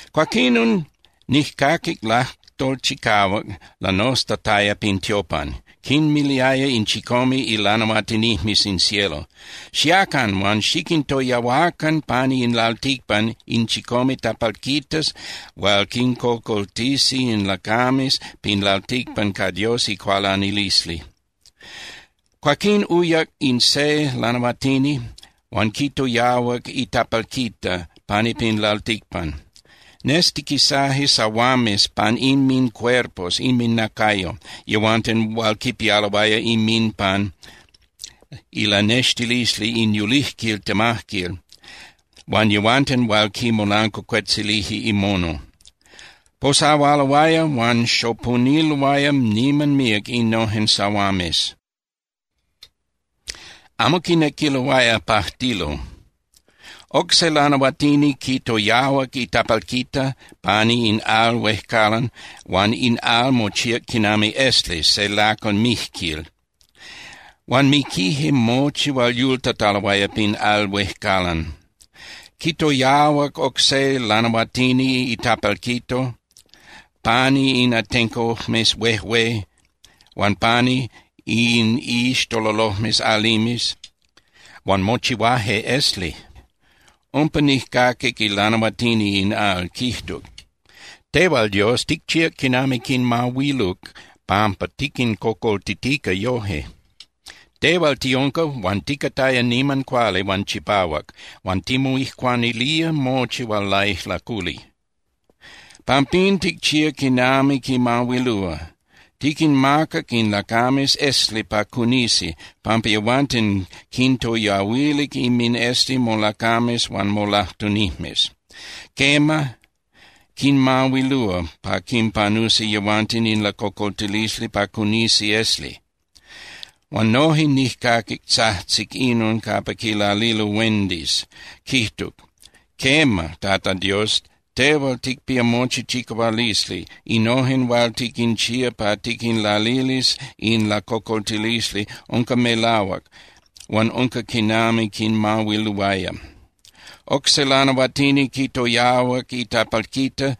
Cuaquinon nijcaquic lajtol chicahuac lanoztataya pin tiopan. Quinmiliaya in chicome ilanahuatinijmes in cielo: —Xiacan huan xiquintoyahuacan pani in lalticpan in chicome tapalquitas hual quincocoltisi in lacames pin lalticpan ca Dios icualanilisli. Cuaquín uyac in se lanahuatini huan quitoyahuac itapalquita pani pin lalticpan. Nestiquisaje sahuames pan inmincuerpos (inminacayo) yehuanten hual quipialoaya inminpan ilanextilisli in yulijquil temajquil huan yehuanten hual quimolancuacuetzilije imono. Posahualoaya huan xopuniloaya niman míac innojen sahuames. Amo quinequiloaya pajtilo. Oc se lanahuatini quitoyahuac itapalquita pani in al huejcalan huan in al mochíac quinami iesli se lacal mijquil. Huan miquije mochi hual yultataloaya pin al huejcalan. Quitoyahuac oc se lanahuatini itapalquito pani in atencojmes huejué huan pani in iixtololojmes alimes, huan mochihuaje esli. Umpa, nijcaquic ilanahuatini in al, quijtuc: —Tehual, Dios, ticchíac quinami quinmahuiluc pampa tiquincocoltitica yoje. Tehual tiunca huan ticataya niman cuali huan chipahuac huan timoijcuanilía mochi hual laijlaculi. Pampín, ticchía quinami quinmahuilúa. Tiquinmacac in lacames esli pa cunisi, pampa yehuanten quintoyahuilic inminesli molacames huan molajtunijmes. Quema, quinmahuilúa pa quinpanusi yehuanten in lacocoltilisli pa cunisi esli. Huan noje nijcaquic tzajtzic inon capa quilalilo huendis, quijtuc: —Quema, Tata Dios, tehual ticpía mochi chicahualisli, innojen hual tiquinchía pa tiquinlalilis in lacocoltilisli, unca melahuac huan unca quinami quinmahuiluaya. Oc se lanahuatini quitoyahuac itapalquita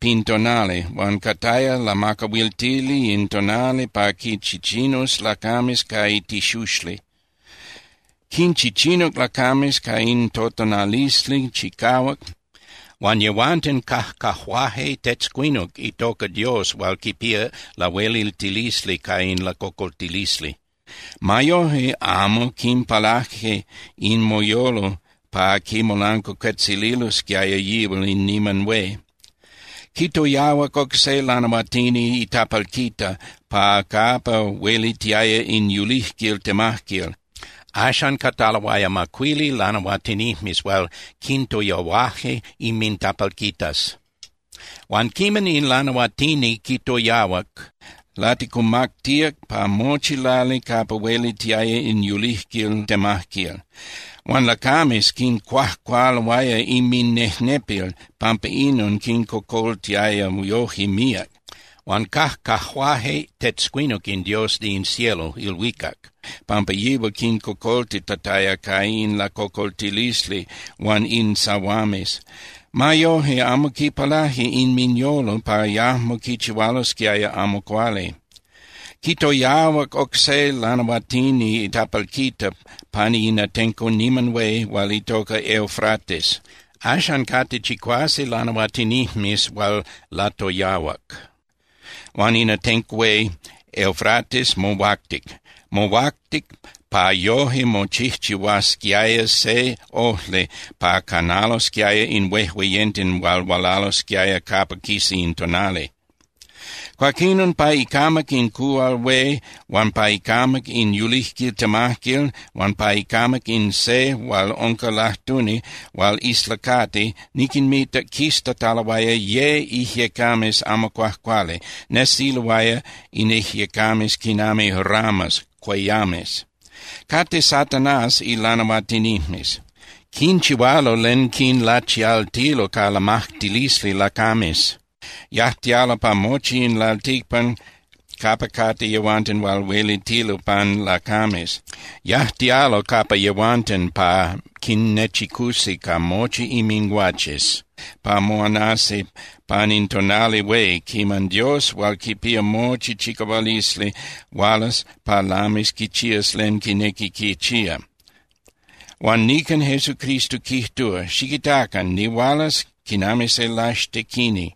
pin tonali, huan cataya lamacahuiltili in tonali pa quinchichinus lacames ca itixuxli. Quinchichinuc lacames ca in totonalisli chicahuac huan yehuanten cajcajuaje tetzcuinuc itoca Dios hual quipía lahueliltilisli ca in lacocoltilisli. Ma yoje, amo quinpalaje inminyolo pa quimolancuacuetzililosquiaya yihual in niman hué. Quitoyahuac oc se lanahuatini itapalquita pa capa huelitiaya in yulijquil temajquil. Axan cataloaya macuili lanahuatinijmes hual quintoyahuaje inmintapalquitas. Huan quiman in lanahuatini quitoyahuac, laticumactíac pa mochi lali capa huelitiaya in yulijquil temajquil. Huan lacames quincuajcualoaya inminejnepil pampa inon quincocoltiaya yoje míac. Huan cajcajuaje tetzcuinuc in Dios de in cielo (ilhuicac) pampa yihual quincocoltitataya ca in lacocoltilisli huan in sahuames. Ma yojque amo quipalaje inminyolo pa yajmo quichihualosquiaya amo cuali. Quitoyahuac oc se lanahuatini itapalquita pani in atenco niman hué hual itoca Eufrates. Axan cate chicuase lanahuatinijmes hual latoyahuac. Huan in atenco hué Eufrates mohuactic. Mohuactic pa yoje mochijchihuasquiaya se ojli pa canalosquiaya in huejueyenten hual hualalosquiaya capa quisa in tonali. Cuaquinon pa icamac in cuhual hué huan pa icamac in yulijquil temajquil huan pa icamac in se hual unca lajtuni hual islacati niquinmitac quistataloaya ye ijyecames amo cuajcuali, nesiloaya in ijyecames quinami ranas (cueyames). Cate Satanás ilanahuatinijmes, quinchihualo len quinlachialtilo ca lamajtilisli lacames. Yajtialo pa mochi in lalticpan capa cate yehuanten hual huelitilo pan lacames. Yajtialo capa yehuanten pa quinnechicusi ca mochi inminguaches pa moanasi pan in tonali hué quiman Dios hual quipía mochi chicahualisli hualas pa lamis quichías len quinequi quichía. Huan nican Jesucristo quijtúa: “Xiquitacan, nihualas quinami se laxtequini.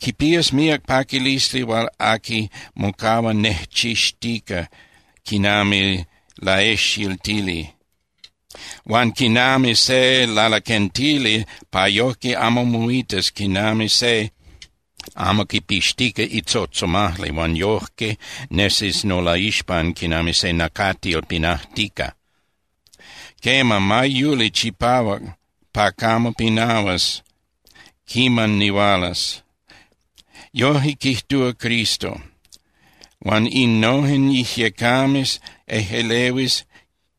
Quipías míac paquilisli hual aqui mocahua nejchixtica quinami laejxiltili, huan quinami se lalaquentili pa yojque amo moitas quinami se amo quipixtica itzotzomajli huan yojque nesis nolaixpan quinami se nacatil pinajtica. Quema, ma yuli chipahuac pa camo pinahuas quiman nihualas.” Yojque quijtúa Cristo. Huan innojen ijyecames ejꞌelehuis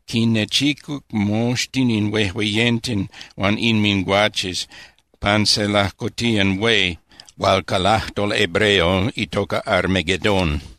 quinnechicuc moxtin in huejueyenten huan inminguaches pan se lajcotiyan hué hual ca lajtol hebreo itoca Armagedón.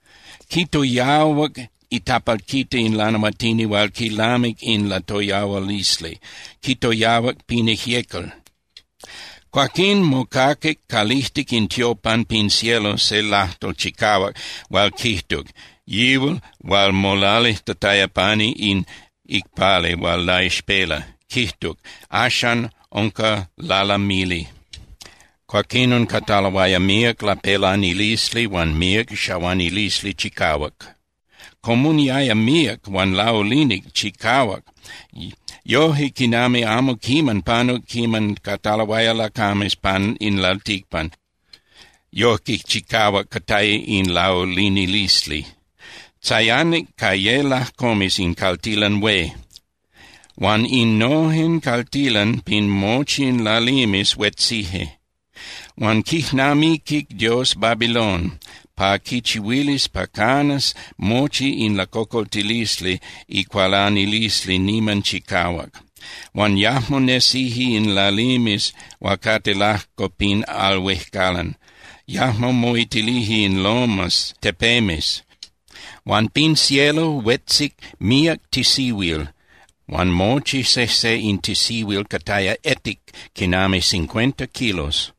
Quitoyahuac itapalquita in lanahuatini hual quilamic in latoyahualisli, quitoyahuac pin ijyecal. Cuaquín mocaquic calijtic in tiopan pin cielo se lajtol chicahuac hual quijtuc yihual hual molalijtataya pani in icpali hual laixpela, quijtuc: —Axcan unca lalamili. Cuaquinon cataloaya míac lapelanilisli huan míac xahuanilisli chicahuac. Comuniaya míac huan laulinic chicahuac yoje quinami amo quiman panuc quiman cataloaya lacames pan in lalticpan, yojque chicahuac cataya in laulinilisli. Tzayanic ca ye lajcomes in caltilan hué, huan innojen caltilan pin mochi in lalimes huetzije. Huan quijnamiquic Dios Babilón pa quichihuilis pa canas mochi in ilacocoltilisli icualanilisli niman chicahuac. Huan yajmo nesije in lalimes hual cate lajco pin al huejcalan, yajmo moitilije in lomas (tepemes). Huan pin cielo huetzic míac tisihuil huan mochi sejse in tisihuil cataya etic quinami cincuenta kilos.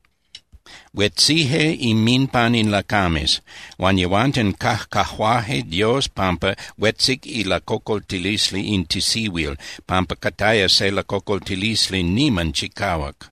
Huetzije inminpan in lacames. Huan yehuanten cajcajuaje Dios pampa huetzic ilacocoltilisli in tisihuil, pampa cataya se lacocoltilisli niman chicahuac.